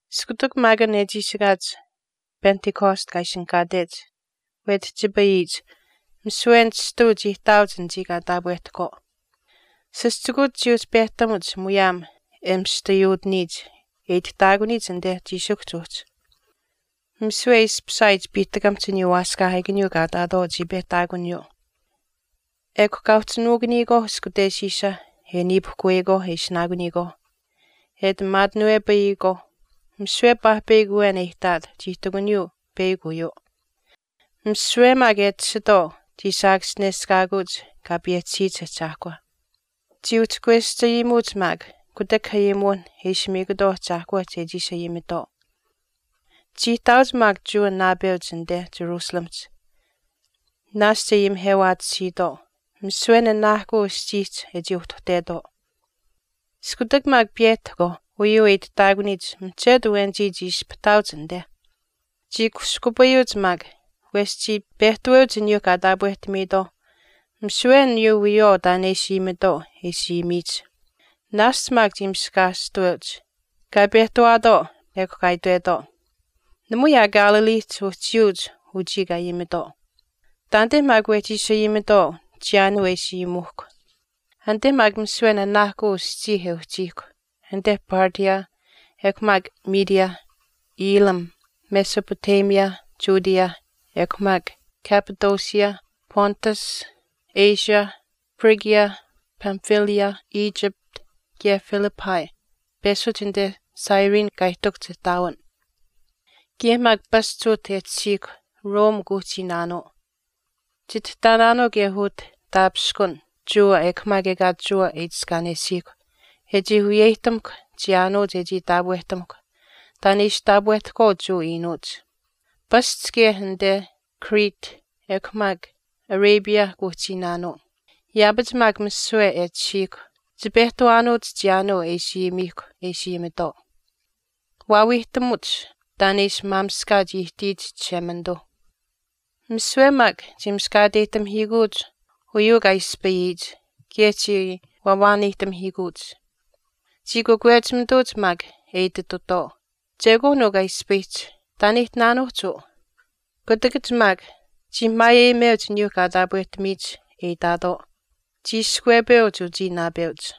Iskutak maak an e chiishikaach Pentecost kaa ishinihkaatech wetihchipayihch misiwe nishtau chii ihtaauch anichii kaa taapwehtahkwaau. Sischikuuch chii uhchi pehtamuch muyaam e mistayuutiniyich e itihtaakuniyich anite chiishikuhch uhchi. Misiwe e ishpishaayich piihtakamihch aniyuu waaskaahiikaniyuu kaa ihtaatwaau chii pehtaakuniyuu. Ekw kaa uhchi nuukuniyikwaauh ishkuteshiisha e niipuhkuweyikwaau e ishinaakuniyikwaauh e ati maatinuwepayiyikwaau, misiwe paahpeyakw awen e ihtaat chii ihtakuniyuu peyakw uyuu. Misiwe maak e tashitwaau chii saakaschineshkaakuuch Kaa payehchisiyich Ahchaahkwa. Chii uhchi kweschayimuuch maak kutak ayimuwinh e ishi miikutwaau Ahchaahkwa chechii ishi ayimitwaau. Chii ihtaauch maak Jewa naapeuch anite Jerusalemihch naashch e ayimihewaatisiitwaau misiwe nanaahkuu aschiihch e chii uhtuhtetwaau. Iskutak maak piyehtahkwaau uyuu e itihtaakuniyich mihchetu awenichii chii ispahiituuch anite. Chii kushkupayuuch maak wesh chii pehtaweuch aniyuu kaa taapwehtamiitwaauh misiwe aniyuu wiyawaau taan e ishi ayimitwaau e ishi ayimiyich. Naashch maak chii miskaashtaweuch kaa pehtawaatwaau ekw kaa itwetwaau, “Namui aa Galileehch uhchiyuuch uchii kaa ayimitwaau. Taanite maak wehchi ishi ayimitwaau chiyaanuu e ishi ayimuuhkw. Anite maak misiwe nanaahkuu aschii e uhchiihkw anite Parthia ekw maak Media, Elam, Mesopotamia, Judea ekw maak Cappadocia, Pontus, Asia, Phrygia, Pamphylia, Egypt, kaye Libya peshuch anite Cyrene kaa ihtakuhch ihtaawin. Kaye maak pasch utah e tashiihkw Rome kuuhchiinaanuu. Chitihtaanaanuu kaye utah taapishkun Jewa ekw maak ekaa Jewa e itiskaanesiihkw e chii wiyeyihtamuhkw chiyaanuu chechii taapwehtamukw taan e ishi taapwehtahkwaau Jewa iinuuch. Pasch kaye anite Crete ekw maak Arabia kuuhchiinaanuu. Yaapach maak misiwe e tashiihkw chipehtawaanuuch chiyaanuu e ishi ayimiihkw e ishi ayimitwaau. Waawiihtamuch taan e ishi maamishkaach ihtiyich Chishemanituu.” Misiwe maak chii miskaateyihtamihiikuuch uyuu kaa ispayiyich kaye chii wawaaneyihtamihiikuuch. Chii kakwechimituuch maak e ititutwaau, “Chekwaan uu kaa ispayihch, taan e ihtinaanuuhch uu.” Kutakach maak chii maayeyimeuch aniyuu kaa taapwehtamiyich e itaatwaau, “Cchiishkwepeuch uchii naapeuch.”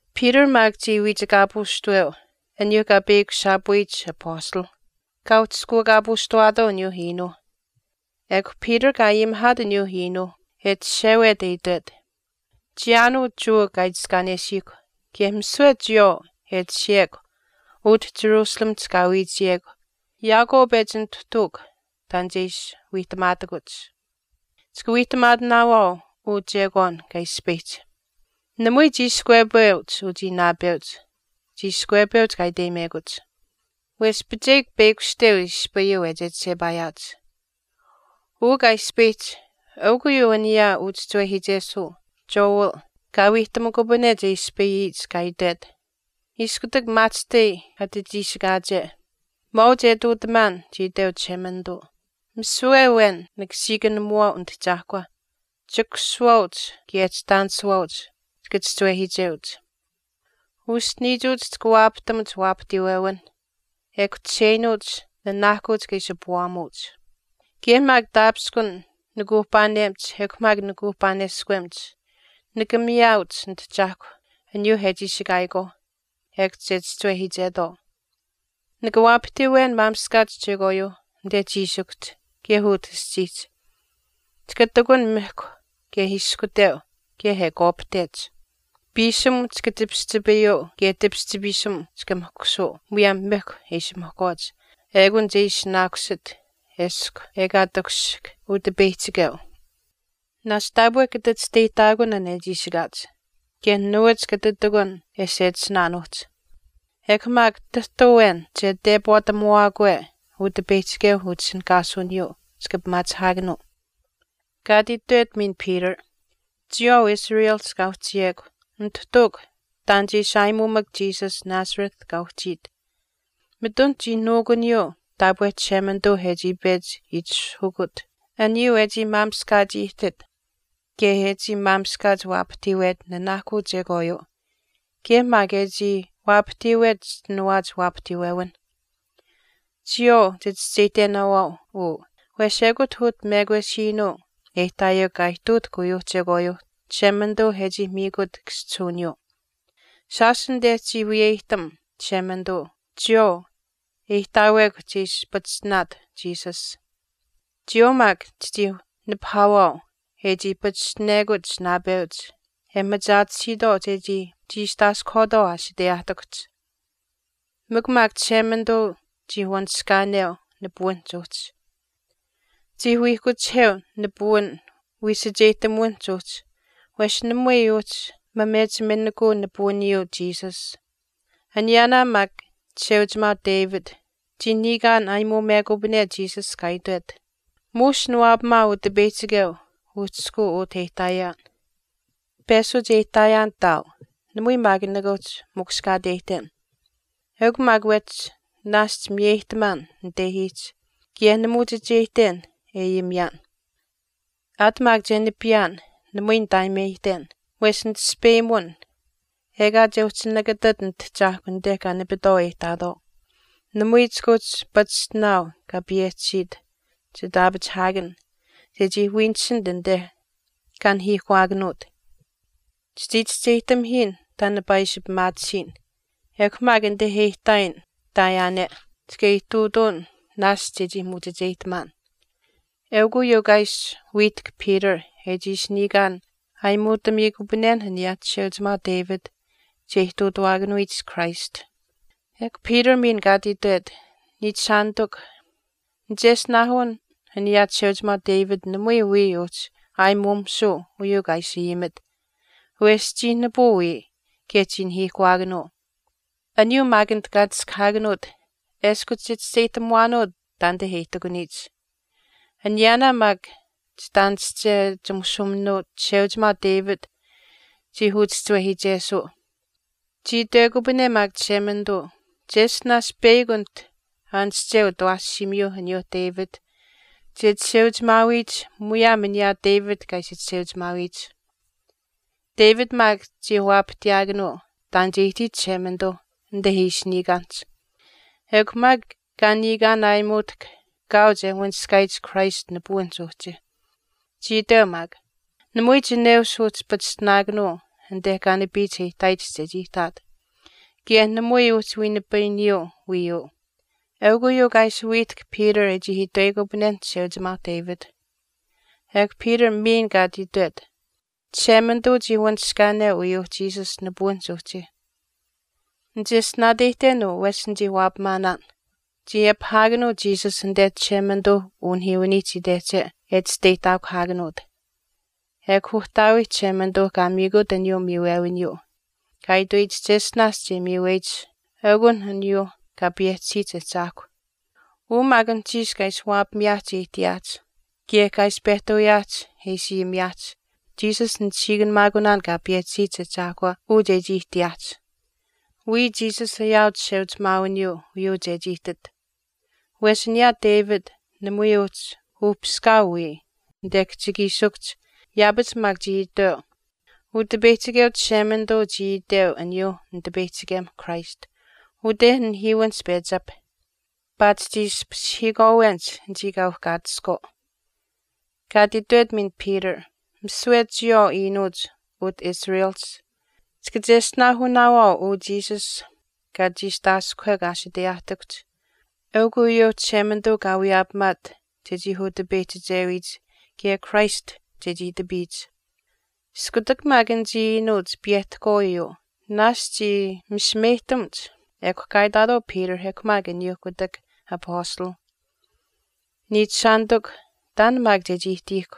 Peter maak chii wiichikaapuushtaweu aniyuu kaa peyakushaapuyich apastalh. Kaa uhchishkuukaapuushtawaatwaau aniyuu iinuu. Ekw Peter kaa ayimihaat aniyuu iinuu e chishewet e itwet, “Chiyaanuu Jewa kaa itiskaanesiihkw kaye misiwe chiyawaau e tashiyekw utah Jerusalemihch kaa wiichiyekw yaakwaau pechi nituhtuukw taan che ishi wiihtamaatakuch. Chika wiihtamaatinaawaau uu chekwaan kaa ispayihch. Namui chiishkwepeuch uchii naapeuch chiishkwepeuch kaa iteyimekuch. Wesh picheyik peyakushteu ispayuu e chechishepaayaach. Uu kaa ispayihch eukw uyuu aniyaa uchischiwehiichesuu Joel kaa wiihtamukupane che ispayiyich, kaa itwet, Iskutak maahchishtai ati chiishikaache maau che ihtuutamaan chii iteu Chishemanituu, misiwe awen nika siikanimuwaau Nitahchaahkwa, chikusuwaauch kaye chitaanisuwaauch chika chischiwehiicheuch. Uschiniichuuch chika waapahtamuch waapahtiiwewinh ekw chisheinuuch nanaahkuu chika ishi puwaamuuch. Kaye maak taapishkun nikuuhpaanemach ekw maak nikuuhpaaneskwemach nika miyaauch Nitahchaahkwa aniyuuh e chiishikaayikwaauh, ekw che chischiwehiichetwaau. Nika waapahtiiwen maamishkaach chekwaayuu anite chiishikuhch kaye utah aschiihch. Chika ihtakun mihkw kaye ishkuteu kaye e kwaapahtech. Piisim chika tipischipayuu kaye tipischipiisim chika mihkusuu muyaam mihkw e ishi mihkwaach ekun che ishinaakusit eshkw ekaa che takushihk Utipeyihchikeu. Naashch taapwe kata chisteyihtaakun an e chiishikaach kaye nuwach kata ihtakun e sechisinaanuuhch. Ekw maak tahtu awen che tepwaatamuwaakwe Utipeyihchikeu utishinihkaasuwiniyuu, chika pimaachihaakanuu.” Kaa ati itwet miin Peter, “Chiyawaau Israelihch kaa uhchiyekw Nituhtuukw taan che ishi aayimuumak Jesus Nazareth kaa uhchiit. Mitun chii nuukuniyuu taapwe Chishemanituuh e chii pechi itishahukut aniyuu e chii maamishkaach ihtit kaye e chii maamishkaach waapahtiiwet nanaahkuu chekwaayuu kaye maak e chii waapahtiiwet chischinawaach waapahtiiwewinh. Chiyawaau chichischeyihtenaawaau uu wesh ekut utah mekwesiinuu e ihtaayekw kaa ihtuutahk uyuuh chekwaayuuh Chishemanituuh e chii miikut kaschihuwiniyuu. Shaash anite chii wiyeyihtam Chishemanituu chiyawaau e ihtaawekw che ishi pachishtinaat Jesus, chiyawaau maak chichii nipahaawaau e chii pachishtinekuch naapeuch e machaatisiitwaau chechii chiistaaskuhwaatwaau aashiteyaahtikuhch. Mikw maak Chishemanituu chii wanishkaaneu nipuwinihch uhchi. Chii wiihkuchiheu nipuwin wiisacheyihtamuwinihch uhchi wesh namui uhchii mamechiminikuu nipuwiniyuu Jesus. Aniyaanaa maak chisheuchimaau David chii niikaan aayimuumekupane Jesus kaa itwet, Muush niwaapamaau Utipeyihchikeu uhchishkuu utah e ihtaayaan. Peshuch e ihtaayaan ihtaau namui maak nikaa uhchi mukushkaateyihten. Eukw maak wehchi naashch miyeyihtamaan nitehiihch kaye nimuuchicheyihten e ayimiyaan. Aat maak che nipiyaan, namui nitaayimeyihten wesh nitaspeyimun, ekaa che uhchi nakatat nitahchaahkw anite kaa nipitwaau e ihtaatwaau, namui chika uhchi pachishtinaau kaa payehchisiit chitaapachihaakan chechii wiinisinit anite kaa nahiihkuwaakanuut. Chichii chischeyihtamihiin taan nipaa ishi pimaatisiin, ekw maak anite e ihtaayin ihtaayaane chika ihtuutuun naashch chechii muuchicheyihtamaan.” eukw uyuu kaa ishi wiihtahk Peter e chii ishi niikaan aayimuutamiikupanen aniyaa chisheuchimaau David che ihtuutawaakanuyich Christ. Ekw Peter miin kaa ati itwet, “Niichishaanitikw, nicheshtinaahun aniyaa chisheuchimaau David namui wiya uhchi aayimuumisuu uyuu kaa ishi ayimit, wesh chii nipuu wiya kaye chii nahiihkuwaakanuu. Aniyuu maak anit kaa chiskahaakanuut eshkw chichischeyihtamuwaanuu taanite e ihtakuniyich. Aniyaanaa maak chitaanische chimushuuminuu chisheuchimaau David chii uchischiwehiichesuu. Chii itwekupane maak Chishemanituu cheshtinaash peyakw anit aanische utawaashiimiyuuh aniyaa David che chisheuchimaawiyich muyaam aniyuu David kaa ishi chisheuchimaawiyich. David maak chii waapahtiyaakanuu taan che ihtiyich Chishemanituu anite ishi niikaanihch, ekw maak kaa niikaan aayimuutahk kaau che wanishkaayich Christ nipuwinihch uhchi. Chii itweu maak, namui chineush uhchi pachishtinaakanuu anite kaa nipiyich e ihtaayich chechii ihtaat, kaye namui uhchi wiinipayiniyuu wiiyuu.” Eukw uyuu kaa ishi wiihtahk Peter e chii itweyikupanenh chisheuchimaau David. Ekw Peter miin kaa ati itwet, “Chishemanituu chii wanishkaaneu uyuu Jesus nipuwinihch uhchi. Nichischeyihtenaan uu wesh nichii waapamaanaan. Chii apihaakanuu Jesus anite Chishemanituuh unihiiwiniihch itehche e chisteyihtaakuhaakanuut. Ekw Uhtaawiih Chishemanituuh kaa miikut aniyuu miiwewiniyuu kaa itweyich cheshtinaash che miiweyich eukun aniyuuh Kaa payehchisiyich Ahchaahkwa. Uu maak anuhchiish kaa ishi waapamiyaahch e ihtiyaahch kaye kaa ishi pehtuuyaahch e ishi ayimiyaahch Jesus nisiikanimaakunaan Kaa payehchisiyich Ahchaahkwa uu chechii ihtiyaahch. Wiya Jesus ayaau chisheuchimaawiniyuu uyuu chechii ihtit. Wesh aniyaa David namui uhchi uhpiskaau wiya anite kihchikiishikuhch yaapach maak chii itweu, Utipeyihchikeu Chishemanituu chii iteu aniyuuh Nitipeyihchikem Christ, Ute nihiiwinihch pechi apih, paatish chii ashpashihiikwaawenich anichii kaa uhkaatiskwaau.” Kaa ati itwet miin Peter, “Misiwe chiyawaau iinuuch utah Israelihch chika cheshtinaahunaawaau uu Jesus kaa chiistaaskuhwekw aashiteyaahtikuhch eukw uyuu Chishemanituu kaa wiyaapamaat chechii utipeyihchichewiyich kaye Christ chechii itapiyich.” Iskutak maak anichii iinuuch piyehtahkwaau uyuu naashch chii misimeyihtamuch ekw kaa itaatwaau Peter ekw maak aniyuuh kutak Apastalh, “Niichishaanitikw, taan maak chechii ihtiihkw.”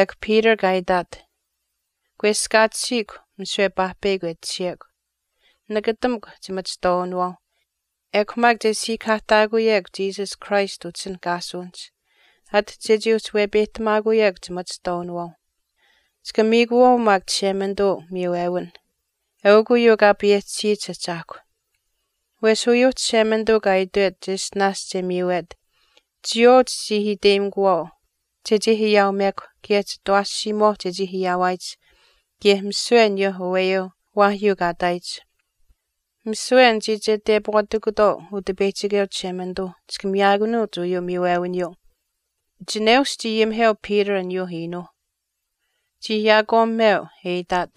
Ekw Peter kaa itaat, “Kweskaatisiikw misiwe paahpeyakw e tashiyekw. Nakatamukw chimachihtwaawinawaauh ekw maak che siikahaahtaakuyekw Jesus Christ utishinihkaasuwinihch ati chechii uhchi wepeyihtamaakuyekw chimachihtwaawinawaauh. Chika miikuwaau maak Chishemanituu umiiwewin, eukw uyuu Kaa payehchisiyich Ahchaahkwa. Wesh uyuuh Chishemanituu kaa itwet cheshtinaash che miiwet chiyawaau chichii iteyimikuwaau chechii ayaaumekw kaye chitawaashiimuwaauh chechii ayaawaayich kaye misiwe aniyuuh aweyuuh waahyuu kaa ihtaayich. Misiwe anichii che tepwaatikutwaau Utipeyihchikeu Chishemanituu chika miyaakanuuch uyuu miiwewiniyuu.” Chineush chii ayimiheu Peter aniyuu iinuu. Chii yaakwaamimeu, e itaat,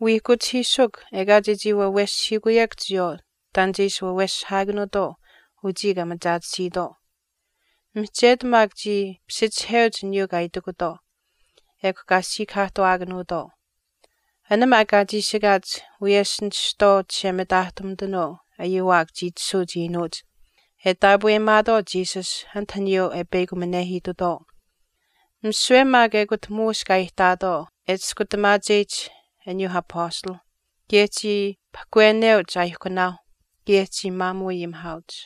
“Wiihkuchihiisukw ekaa chechii waweshihiikuyekw chiyawaau taan che ishi waaweshihaakanuutwaau uchii kaa machaatisiitwaau.” Mihchetu maak chii pishichiheuch aniyuu kaa itikutwaau. Ekw kaa siikahaahtuwaakanuutwaau. An maak kaa chiishikaach wiyesh nishtwaau chishemitaahtumitanuu ayuwaak chii tashuuch iinuuch e taapweyimaatwaau Jesus anit aniyuu e peyakuminehiitutwaau. Misiwe maak ekut muush kaa ihtaatwaau e chiskutamaacheyich aniyuuh Apastalh kaye chii pahkweneuch aaihkunaauh kaye chii maamuu ayimihaauch.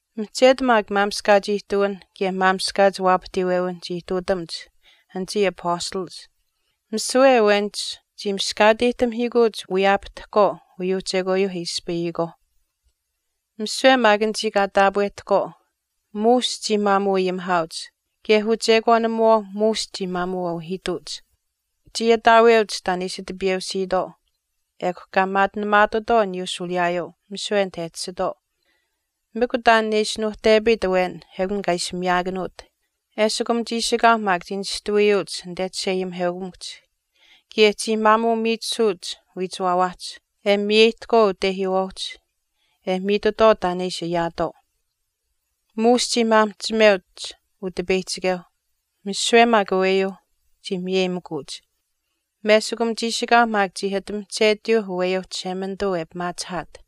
Mihchetu maak maamishkaach ihtuwinh kaye maamishkaach waapahtiiwewinh chii ihtuutamuch anichii apastalach. Misiwe awenich chii miskaateyihtamihiikuuch wiyaapahtahkwaau uyuu chekwaayuu e ispayihkwaau. Misiwe maak anichii kaa taapwehtahkwaau muush chii maamuu ayimihaauch kaye uchekwaanimuwaau muush chii maamuu auhiituuch. Chii ataaweuch taan e ishi tipiyeusiitwaau ekw kaa maatinamaatutwaau aniyuu shuuliyaayuu misiwe anit e tashitwaau. Mikw taan e ishi nuuhtepayit awen ekun kaa ishi miyaakanuut. Eshikum chiishikaau maak chii nishtawiyuuch anite chisheayimiheukamikuhch kaye chii maamuu miichisuuch wiichiwaawaahch, e miyeyihtahkwaau utehiiwaauch e miitutwaau taan e ishi ayaatwaau. Muush chii maamihchimeuch Utipeyihchikeu. Misiwe maak aweyuu chii miyeyimikuuch. Meshikum chiishikaauh maak chii ati mihchetiyuu aweyuu Chishemanituu e pimaachihaat.